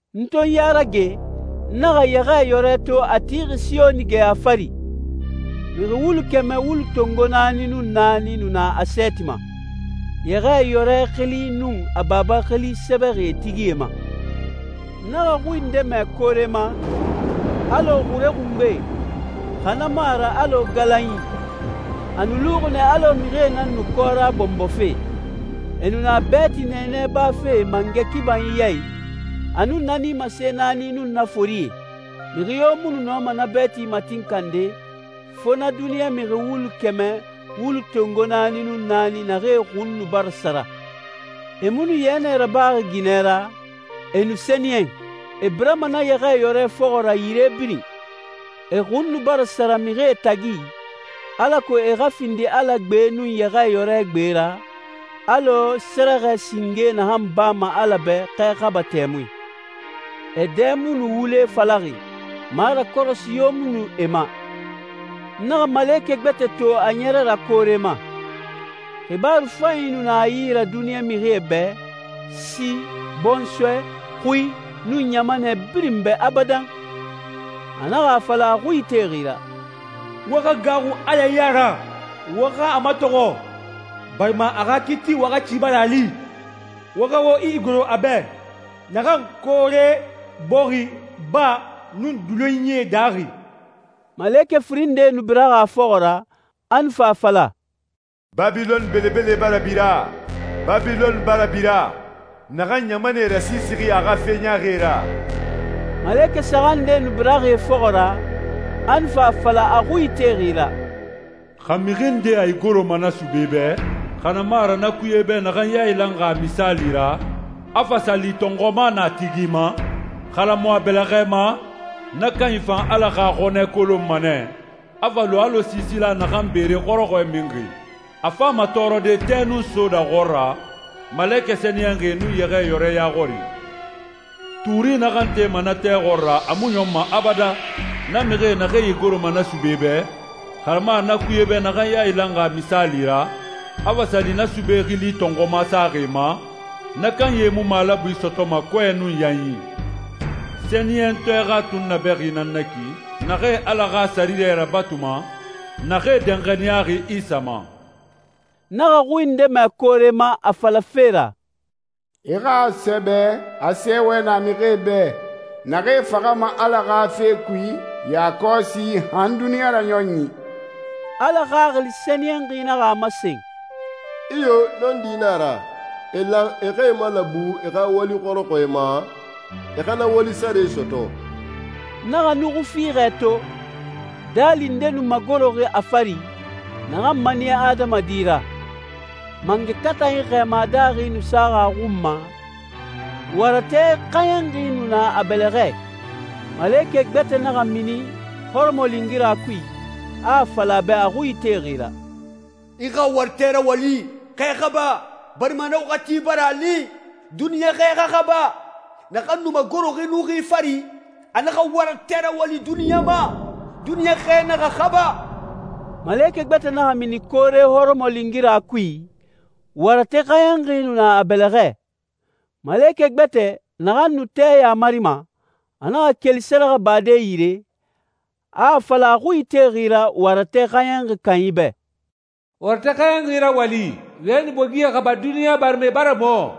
N to n ya rage, n naxa Yɛxɛɛyɔrɛ to a tixi Siyoni geya fari. Mixi wulu kɛmɛ wulu tongo naani nun naani nu na a sɛɛti ma, Yɛxɛɛyɔrɛ xili nun a Baba xili sɛbɛxi e tigie ma. N naxa xui nde mɛ koore ma, alɔ xure xungbe, xa na mu a ra alɔ galanyi. A nu luxi nɛ alɔ mixie nan nu kɔra bɔnbɔfe. E nu na bɛɛti nɛɛnɛ bafe mangɛ kibanyi ya i, a nun na nimase naani nun na forie. Mixi yo mu nu nɔma na bɛɛti matinkande, fo na duniɲa mixi wulu kɛmɛ wulu tongo naani nun naani naxee xun nu bara sara. E mu nu yɛnɛ rabaxi ginɛ ra, e nu sɛniyɛn. E birama na Yɛxɛɛyɔrɛ fɔxɔ ra yire birin. E xun nu bara sara mixie tagi, alako e xa findi Ala gbe nun Yɛxɛɛyɔrɛ gbe ra, alɔ sɛrɛxɛ singe naxan bama Ala bɛ xɛ xaba tɛmui. E dɛ mu nu wule falaxi, marakɔrɔsi yo mu nu e ma. N naxa malekɛ gbɛtɛ to a ɲɛrɛ ra koore ma. Xibaaru fanyi nu na a yi ra duniɲa mixie bɛ, si, bɔnsɔɛ, xui, nun ɲamanɛ birin bɛ abadan. A naxa a fala a xui itexi ra, «Wo xa gaaxu Ala ya ra, wo xa a matɔxɔ, barima a xa kiiti waxati bara a li. Wo xa wo igoro a bɛ, naxan koore, bɔxi, baa, nun dulonyie daaxi.» Malekɛ firin nde nu biraxi a fɔxɔ ra, a nu fa a fala, «Babilɔn belebele bara bira. Babilɔn bara bira, naxan ɲamanɛe rasiisixi a xa fe ɲaaxie ra.» Malekɛ saxan nde nu biraxi e fɔxɔ ra, a nu fa a fala a xui itexi ra, «Xa mixi nde a igoroma na sube bɛ, xa na mu a ra na kuye bɛ naxan yailanxi a misaali ra, a fa sa li tɔnxuma na a tigi ma, xa na mu a bɛlɛxɛ ma, na kanyi fan Ala xa xɔnɛ kolonma nɛ, a fa lu alɔ siisila naxan beere xɔrɔxɔɛ minxi. A fama tɔɔrɔde tɛ nun soda xɔɔra, malekɛ sɛniyɛnxie nun Yɛxɛɛyɔrɛ ya xɔri. Tuuri naxan tema na tɛ xɔɔra a mu ɲɔnma abadan. Na mixie, naxee e igoroma na sube bɛ, xa na mu a ra na kuye bɛ naxan yailanxi a misaali ra, a fa sa li na sube xili tɔnxuma saxi e ma, na kanyie mu malabui sɔtɔma kɔɛ nun yanyi. Sɛniyɛntɔɛ xa tunnabɛxi nan na ki, naxee Ala xa sɛriyɛ rabatuma, naxee danxaniyaxi Isa ma.» N naxa xui nde mɛ koore ma a falafe ra, «I xa a sɛbɛ a sɛɛwɛ na mixie bɛ, naxee faxama Ala xa fe kui yakɔsi han duniɲa raɲɔnyi.» Ala Xaxili Sɛniyɛnxi naxa a masen, «Iyo, nɔndi na a ra. E lan e xa e malabu e xa wali xɔrɔxɔɛ ma, e xa na wali sare sɔtɔ.» N naxa nuxui fiixɛ to. Daali nde nu magoroxi a fari, naxan maniya adamadi ra. Mangɛ katanyi xɛɛma daaxi nu saxi a xun ma, waratɛ xɛɲɛnxi nu na a bɛlɛxɛ. Malekɛ gbɛtɛ naxa mini hɔrɔmɔlingira kui, a a fala a bɛ a xui itexi ra, «I xa waratɛ rawali, xɛ xaba, barima na waxati bara a li, duniɲa xɛ xa xaba. Naxan nu magoroxi nuxui fari, a naxa waratɛ rawali duniɲa ma, duniɲa xɛ naxa xaba.» Malekɛ gbɛtɛ naxa mini koore hɔrɔmɔlingira kui, waratɛ xɛɲɛnxi nu na a bɛlɛxɛ. Malekɛ gbɛtɛ, naxan nu tɛ yamarima, a naxa keli sɛrɛxɛbade yire, a a fala a xui itexi ra waratɛ xɛɲɛnxi kanyi bɛ, «Waratɛ xɛɲɛnxi rawali, wɛni bogie xaba duniɲa, barima e bara mɔ.»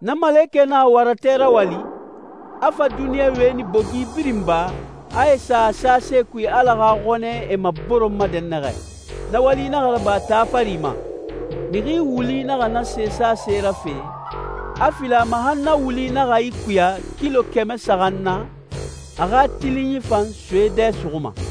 Na malekɛ naxa waratɛ rawali, a fa duniɲa wɛni bogi birin ba, a e sa a sase kui Ala xa xɔnɛ e maboronma dɛnnaxɛ. Na wali naxa raba taa fari ma. Mixi wuli naxa na se sase rafe, a fili a ma han na wuli naxa ikuya kilo kɛmɛ saxan na, a xa tilinyi fan soe dɛ suxuma.